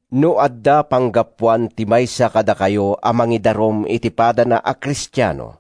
No adda panggapuan ti maysa kadakayo a mangidarum iti padana a Kristiano,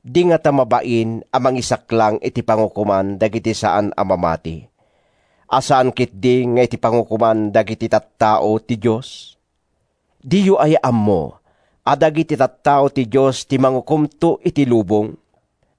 di ngata mabain a mangisaklang iti pangukoman dagiti saan a mamati, a saan ketdi nga iti pangukoman dagiti tattao ti Dios? Diyo aya ammo a dagiti tattao ti Dios ti mangukomto iti lubong?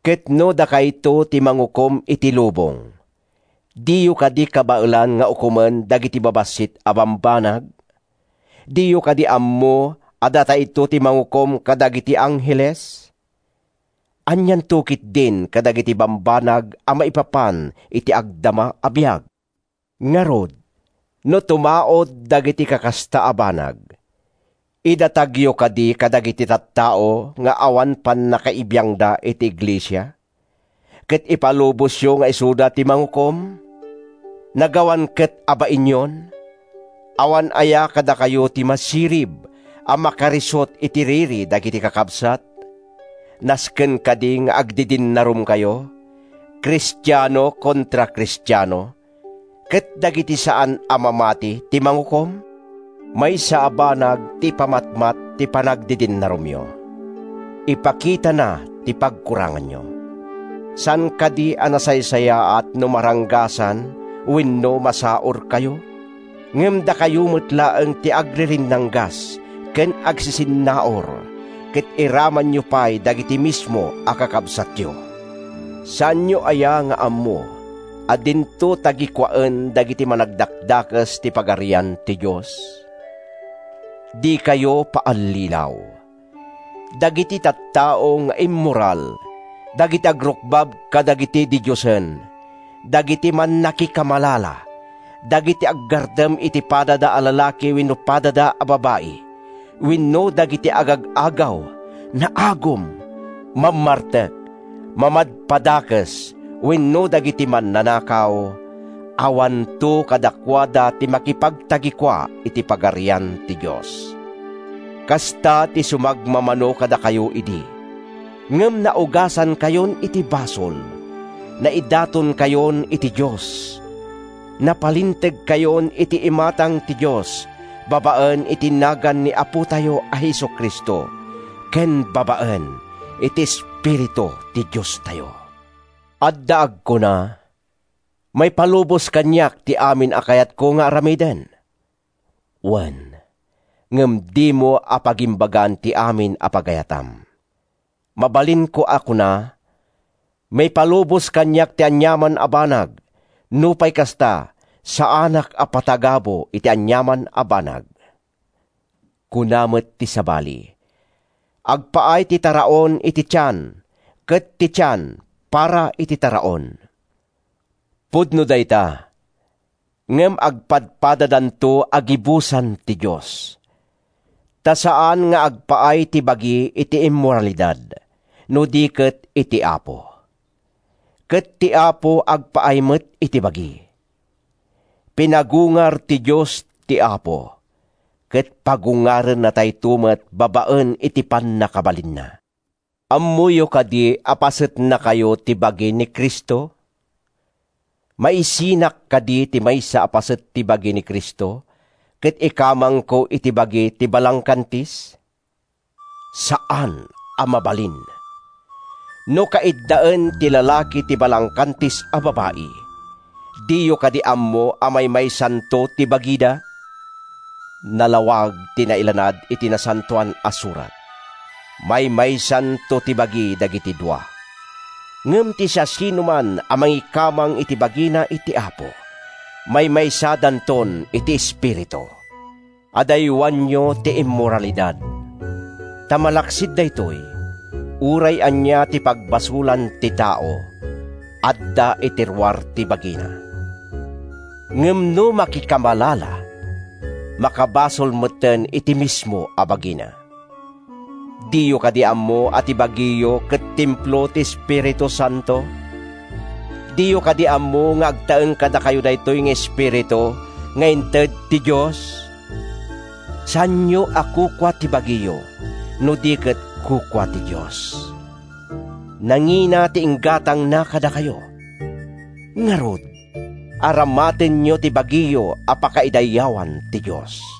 Ket no dakayto ti mangukom iti lubong, diyo kadi kabaelan nga ukomen dagiti babassit a bambanag? Diyo kadi ammo a datayto ti mangukom kadagiti angheles? Anianto ketdin kadagiti bambanag a maipapan iti agdama a biag! Ngarud, no tumaud dagiti kakasta a banag, idatagyo kadi kadagiti tattao nga awan pannakaibiangda iti iglesia, ket ipalubosyo nga isuda ti mangukom? Nagawan ket a bainyon! Awan aya kadakayo ti masirib a makarisut iti riri dagiti kakabsat? Nasken kadi nga agdidinnarumkayo—Kristiano kontra Kristiano—ket dagiti saan a mamati ti mangukom? Maysa a banag ti ipamatmat ti panagdidinnarumyo: Ipakitana ti pagkuranganyo. Saan kadi a nasaysayaat no maranggasan wenno masaurkayo? Ngem dakayo met laeng ti agririnnanggas ken agsisinnaur ket iramanyo pay dagiti mismo a kakabsatyo! Saanyo aya nga ammo a dinto tagikuaen dagiti managdakdakes ti Pagarian ti Dios? Dikayo paallilaw. Dagiti tattao nga immoral, dagiti agrukbab kadagiti didiosen, dagiti mannakikamalala, dagiti aggartem iti padada a lalaki wenno padada a babai wenno dagiti agag-agaw, naagum, mammartek, mamadpadakes wenno dagiti mannanakaw—awanto kadakuada ti makipagtagikua iti Pagarian ti Dios. Kasta ti sumagmamano kadakayo idi. Ngem naugasankayon iti basol, naidatonkayon iti Dios, napalintegkayon iti imatang ti Dios babaen iti nagan ni Apotayo a Jesu-Cristo ken babaen iti Espiritu ti Diostayo. Adda agkuna: “Maipalubos kaniak ti amin a kayatko nga aramiden.” Wen, ngem dimo a pagimbagan ti amin a pagayatam. Mabalinko a kuna: “Maipalubos kaniak ti aniaman a banag. Nupay kasta, saanak a patagabu iti aniaman a banag.” Kuna met ti sabali: “Agpaay ti taraon iti tian, ket ti tian, para iti taraon.” Pudno dayta. Ngem agpadpadadanto a gibusan ti Dios. Ta saan nga agpaay ti bagi iti immoralidad, no di ket iti Apo. Ket ti Apo agpaay met iti bagi. Pinagungar ti Dios ti Apo, ket pagungarennatayto met babaen iti pannakabalinna. Ammoyo kadi a pasetnakayo ti bagi ni Cristo? Maisinak kadi ti maysa a paset ti bagi ni Cristo ket ikamangko iti bagi ti balangkantis? Saan a mabalin! No kaiddaen ti lalaki ti balangkantis a babai, diyo kadi ammo a maymaysanto ti bagida? Nalawag ti nailanad iti Nasantoan a Surat: “Maymaysanto ti bagi dagiti dua.” Ngem ti siasinoman a mangikamang iti bagina iti Apo, maymaysadanton iti espiritu. Adaywanyo ti immoralidad. Ta malaksid daytoy, uray ania ti pagbasolan ti tao, adda iti ruar ti bagina. Ngem no makikamalala, makabasol metten iti mismo a bagina. Diyo kadi ammo a ti bagiyo ket templo ti Espiritu Santo? Diyo kadi ammo nga agtaeng kadakayo daytoy nga Espiritu nga inted ti Dios? Saanyo a kukua ti bagiyo, no di ket kukua ti Dios. Nangina ti inggatangna kadakayo. Ngarud, aramatenyo ti bagiyo a pakaidayawan ti Dios.